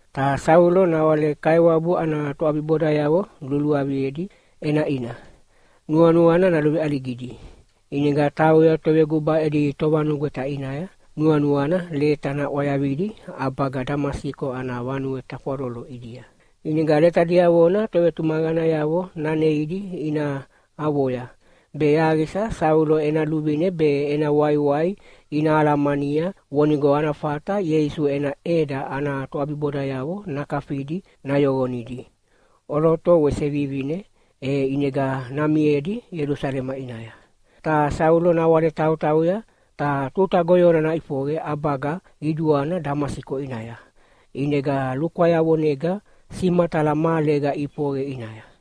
Ta Saulo nawale Kaiwabu ana toʼabibodayavo luluaviedi ʼenaʼina, nuanuana naluveʼaligidi. ʼInega tauya toveguba edi tovanugweta ʼinaya, nuanuana leta naʼwayavidi ʼabaga Damasiko ana vanue tafwaloloyavo ʼidia. ʼInega leta diavona tovetumaqanayavo naneidi ina avoya, be yaqisa Saulo ena luvine be ena waiwai ina alamania vonigo ana fata Ieisu ena ʼEda ana toʼabibodayavo nakafidi nayoqonidi, ʼoloto wese vivine, e ʼinega namiedi Ielusalema ʼinaya. Ta Saulo nawale tautauya ta tuta goyona naʼifoqe ʼabaga qiduana Damasiko ʼinaya, ʼinega lukwayavonega simatala mahalega ʼifoqe ʼinaya.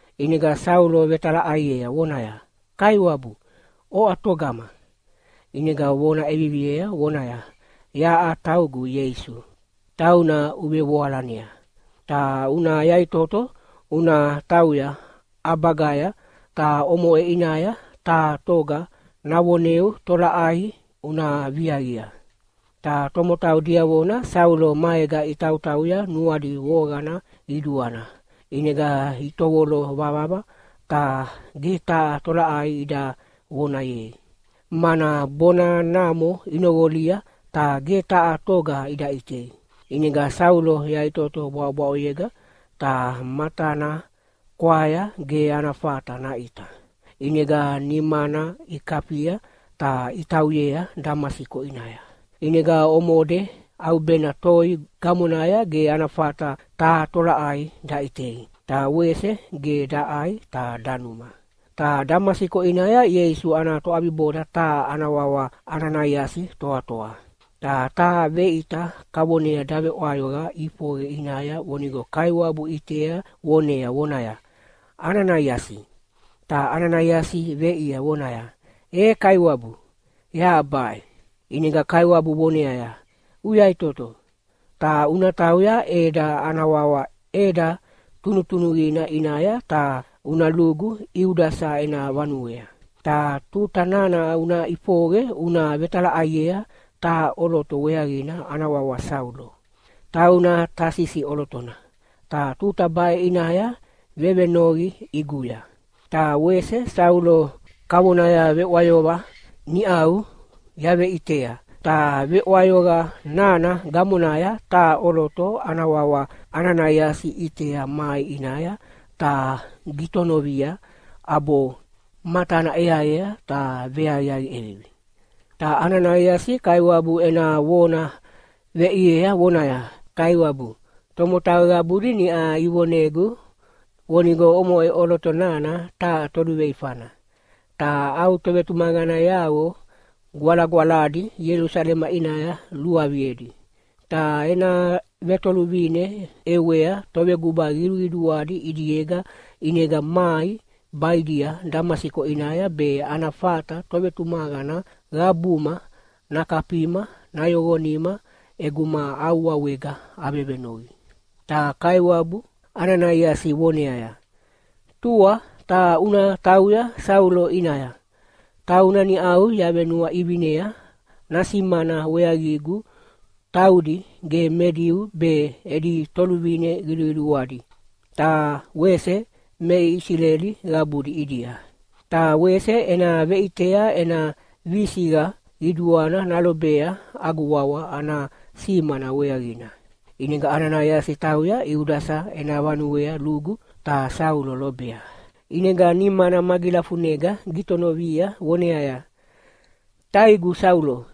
ʼInega Saulo vetalaʼaiea vonaya, “Kaiwabu, oʼa togama?” ʼInega vona ʼeviviea vonaya, “Yaʼa taugu Ieisu, tauna uvevoalanea. Ta una yaʼitoto una tauya ʼabagaya, ta omoʼe ʼinaya taha toga navoneu tolaʼai una viaqia.” Ta tomotau diavona Saulo maega itautauya nuadi voqana qiduana, ʼinega itovolo vavava ta ge taha tolaʼai ida vonayei. Mana bona namo inoqolia ta ge taha toga ida ʼitei. ʼInega Saulo yaʼitoto bwaʼobwaʼoyega, ta matana kwaya ge ana fata naʼita. ʼInega nimana ikafia ta itauyea Damasiko ʼinaya. ʼInega omode ʼaubena toi gamonaya ge ana fata taha tolaʼai daʼitei. Ta wese ge daʼai ta danuma. Ta Damasiko ʼinaya Ieisu ana toʼabiboda taha ana wawa Ananaiasi toatoa. Ta taha veʼita kavonea daveʼwayoqa ʼifoqe ʼinaya vonigo Kaiwabu ʼitea vonea vonaya, “Ananaiasi!” Ta Ananaiasi veʼiea vonaya, “E Kaiwabu, yaʼa baʼe.” ʼInega Kaiwabu voneaya, “Uyaʼitoto, ta una tauya ʼeda ana wawa ʼEda Tunutunuqina ʼinaya ta una lugu Iudasa ena vanuea. Ta tuta nana una ʼifoqe una vetalaʼaiea taha ʼoloto weaqina ana wawa Saulo. Tauna Tasisi ʼolotona, ta tuta baʼe ʼinaya vevenoqi ʼiguya. Ta wese Saulo kavonaya veʼwayoqa niʼau yaveʼitea, ta veʼwayoqa nana gamonaya taha ʼoloto ana wawa Ananaiasi ʼitea mai ʼinaya ta gitonovia ʼabo matana ʼeaea ta veaqiaqi ʼevivi.” Ta Ananaiasi Kaiwabu ena vona veʼiea vonaya, “Kaiwabu, tomotau qabudi niʼa ivonegu vonigo omoʼe ʼoloto nana taha toluveifana, ta au tovetumaqanayavo gwalagwaladi Ielusalema ʼinaya luluaviedi. Ta ena vetoluvine ʼewea toveguba qiduqiduadi ʼidiega ʼinega mai baʼidia Damasiko ʼinaya be ana fata tovetumaqana qabuma nakafima nayoqonima ʼeguma au wawega avevenoqi.” Ta Kaiwabu Ananaiasi voneaya, “Tua ta una tauya Saulo ʼinaya, tauna niʼau yavenuaʼivinea nasimana weaqigu taudi ge me Diu be edi toluvine qiduqiduadi, ta wese me Isileli qabudi ʼidia. Ta wese ena veʼitea ena visiqa qiduana nalobea agu wawa ana simana weaqina.” ʼInega Ananaiasi tauya Iudasa ena vanuea lugu ta Saulo lobea. ʼInega nimana magilafunega gitonovia voneaya, “Taigu Saulo,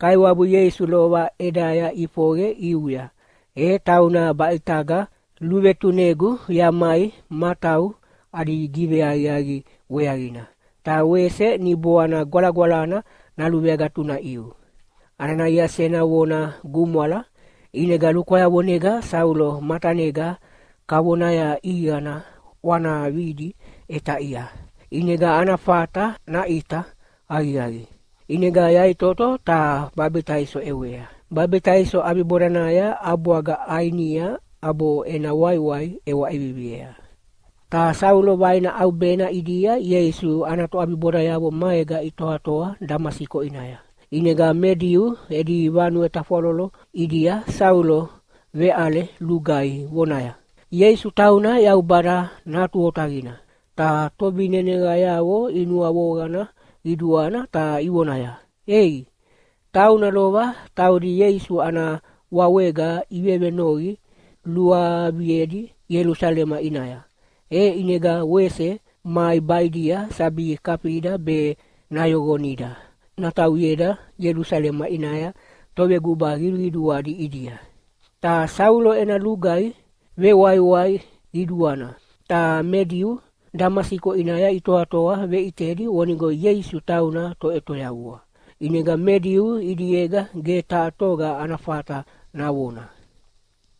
Kaiwabu Ieisu lova ʼedaya ʼifoqe ʼiuya, e tauna baʼitaga luvetunegu yamai matau adi giveaqiaqi weaqina, ta wese Niboana Gwalagwalana naluveagatunaʼiu.” Ananaiasi ena vona gumwala, ʼinega lukwayavonega Saulo matanega kavonaya ʼiqana ʼwanavidi ʼetaʼia, ʼinega ana fata naʼita aqiaqi. ʼInega yaʼitoto ta babitaiso ʼewea. Babitaiso ʼabibodanaya ʼabwaga ʼainia ʼabo ena waiwai ʼewa ʼeviviea. Ta Saulo vaina ʼaubena ʼidia Ieisu ana toʼabibodayavo maega itoatoa Damasiko ʼinaya. ʼInega me Diu edi vanue tafwalolo ʼidia Saulo veʼale lugaihi vonaya, “Ieisu tauna Yaubada Natu Otaqina!” Ta tovineneqayavo inuavoqana qiduana ta ivonaya, “Ei, tauna lova taudi Ieisu ana wawega ivevenoqi luaviedi Ielusalema ʼinaya, e ʼinega wese mai baʼidia sabi kafida be nayoqonida natauyeda Ielusalema ʼinaya toveguba qiduqiduadi ʼidia.” Ta Saulo ena lugaihi vewaiwai qiduana, ta me Diu Damasiko ʼinaya itoatoa veʼitedi vonigo Ieisu tauna Toʼetoyavua. ʼInega me Diu ʼidiega ge taha toga ana fata navona.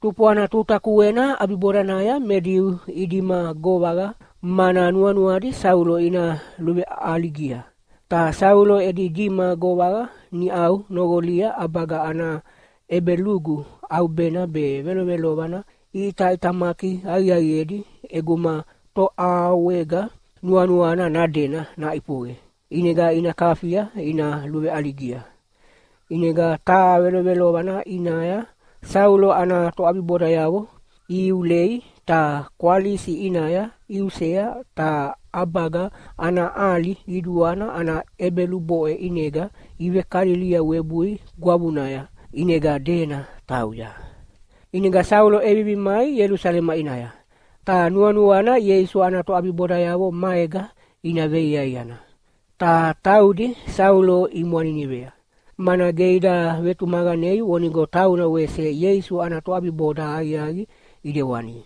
Tufwana tuta kuena ʼabibodanaya me Diu idima govaqa, mana nuanuadi Saulo ina luveʼaligia. Ta Saulo edi dima govaqa niʼau noqolia ʼabaga ana ʼebelugu ʼaubena be velovelovana iʼitamaki aqiaqiedi ʼeguma toʼawega nuanuana nadena naʼifoqe. ʼInega ina kafia ina luveʼaligia. ʼInega taha velovelovana ʼinaya Saulo ana toʼabibodayavo ihiulei ta kwalisi ʼinaya iusea ta ʼabaga ana ʼali qiduana ana ʼebeluboʼe ʼinega ivekalilia webui gwavunaya, ʼinega dena tauya. ʼInega Saulo ʼevivi mai Ielusalema ʼinaya, ta nuanuana Ieisu ana toʼabibodayavo maega ina veiaiana. Ta taudi Saulo imwaninivea, mana ge ida vetumaqanei vonigo tauna wese Ieisu ana toʼabiboda aqiaqi ʼidewani.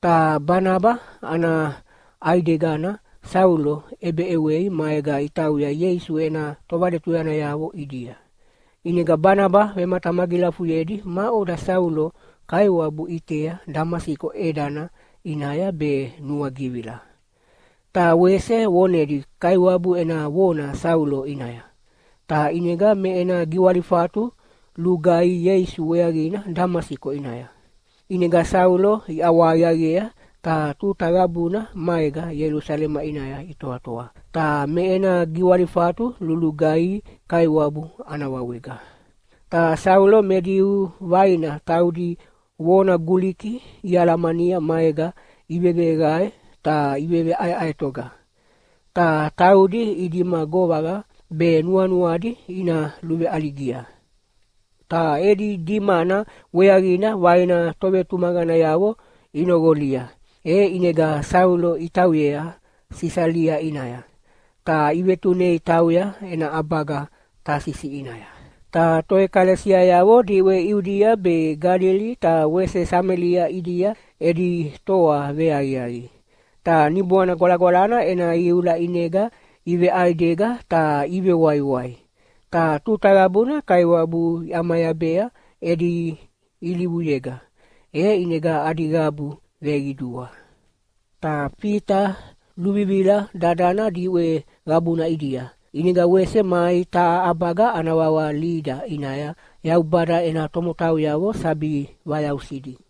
Ta Banaba ana ʼaidegana Saulo ʼebeʼewei maega itauya Ieisu ena tovaletuyanayavo ʼidia. ʼInega Banaba vematamagilafuyedi maʼoda Saulo Kaiwabu ʼitea Damasiko ʼedana ʼinaya be nuagivila. Ta wese vonedi Kaiwabu ena vona Saulo ʼinaya, ta ʼinega me ena giwalifatu lugaihi Ieisu weaqina Damasiko ʼinaya. ʼInega Saulo iʼawahaqiaqiea ta tuta qabuna maega Ielusalema ʼinaya itoatoa, ta me ena giwalifatu lulugaihi Kaiwabu ana wawega. Ta Saulo me Diu vaina taudi vona Guliki ialamania maega iveveqae ta iveʼaeʼaetoga. Ta taudi idima govaqa be nuanuadi ina luveʼaligia. Ta edi dimana weaqina vaina tovetumaqanayavo inoqolia, e ʼinega Saulo itauyea Sisalia ʼinaya, ta ivetunei tauya ena ʼabaga Tasisi ʼinaya. Ta toʼekalesiayavo diʼwe Iudia be Galili ta wese Samelia ʼidia edi toa veaqiaqi. Ta Niboana Gwalagwalana ena iula ʼinega iveʼaidega ta ivewaiwai, ta tuta qabuna Kaiwabu iʼamayabea edi ilivuyega, e ʼinega adi qabu veqidua. Ta Fita luvivila dadana diʼwe qabuna ʼidia. ʼInega wese mai taha ʼabaga ana wawa Lida ʼinaya Yaubada ena tomotauyavo sabi vayausidi.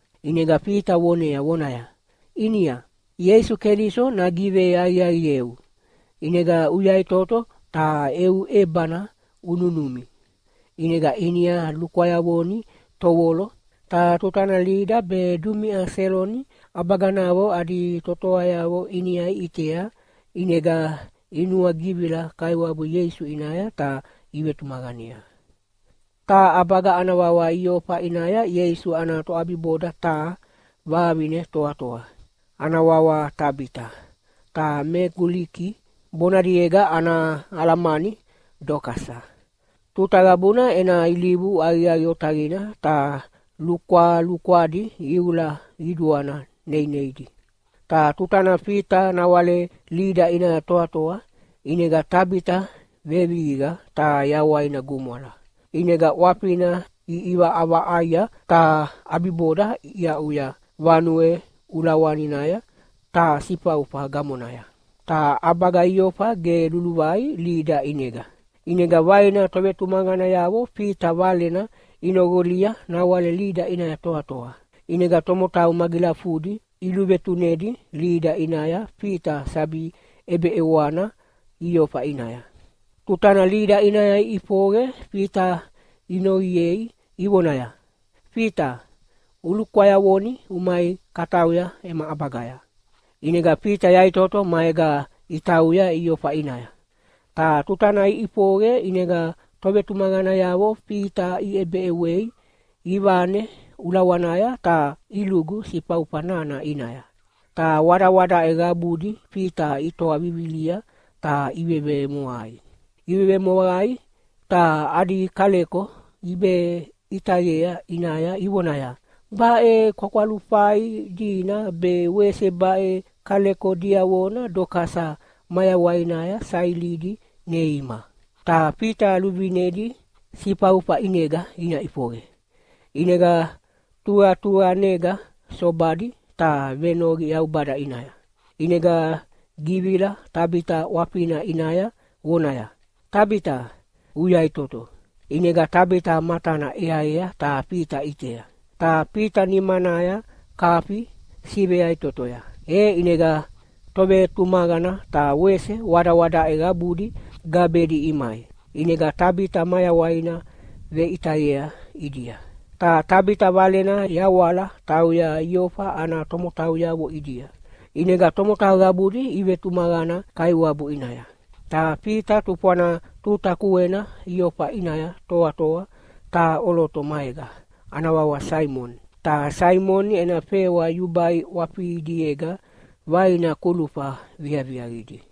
ʼInega Fita vonea vonaya, “Inia, Ieisu Keliso nagiveaqiaqieu, ʼinega uyaʼitoto ta eu ʼebana ununumi.” ʼInega Inia lukwayavoni tovolo. Ta tutana Lida be dumiʼa Seloni ʼabaganavo adi totoayavo Inia iʼitea, ʼinega inuagivila Kaiwabu Ieisu ʼinaya ta ivetumaqanea. Taha ʼabaga ana wawa Iofa ʼinaya Ieisu ana toʼabiboda taha vavine toatoa, ana wawa Tabita (ta me Guliki bonadiega ana alamani Dokasa). Tuta qabuna ena ilivu aqiaqi otaqina ta lukwalukwadi iula qiduana neineidi. Ta tutana Fita nawale Lida ʼinaya toatoa, ʼinega Tabita vevihiqa ta yawaina gumwala. ʼInega ʼwafina iʼivaʼavaʼaia, ta ʼabiboda iaʼuya vanue ulawaninaya taha sifaufa gamonaya. Ta ʼabaga Iofa ge luluvai Lida ʼinega. ʼInega vaina tovetumaqanayavo Fita valena inoqolia nawale Lida ʼinaya toatoa. ʼInega tomotau magilafudi iluvetunedi Lida ʼinaya Fita sabi ʼebeʼewana Iofa ʼinaya. Tutana Lida ʼinaya iʼifoqe Fita inoqiei ivonaya, “Fita, ulukwayavoni umai katauya ema ʼabagaya.” ʼInega Fita yaʼitoto maega itauya Iofa ʼinaya. Ta tutana iʼifoqe ʼinega tovetumaqanayavo Fita iʼebeʼewei ivane ulawanaya ta ilugu sifaufa nana ʼinaya. Ta wadawadaʼe qabudi Fita itoa vivilia ta ivevemoqai. Ivevemoqai ta adi kaleko iveʼitayea ʼinaya ivonaya, “Baʼe kwakwalufai dina be wese baʼe kaleko diavona Dokasa mayawainaya sailidi neima.” Ta Fita luvinedi sifaufa ʼinega ina ʼifoqe, ʼinega tuqatuqanega sobadi ta venoqi Yaubada ʼinaya. ʼInega givila Tabita ʼwafina ʼinaya vonaya, “Tabita, uyaʼitoto!” ʼInega Tabita matana ʼeaea ta Fita ʼitea. Ta Fita nimanaya kafi siveyaʼitotoya, e ʼinega tovetumaqana ta wese wadawadaʼe qabudi gabedi imai. ʼInega Tabita mayawaina veʼitayea ʼidia. Ta Tabita valena yawala tauya Iofa ana tomotauyavo ʼidia, ʼinega tomotau qabudi ivetumaqana Kaiwabu ʼinaya. Ta Fita tufwana tuta kuena Iofa ʼinaya toatoa taha ʼoloto maega, ana wawa Saimoni. Ta Saimoni ena fewa yubai ʼwafidiega vaina kulufa viaviaqidi.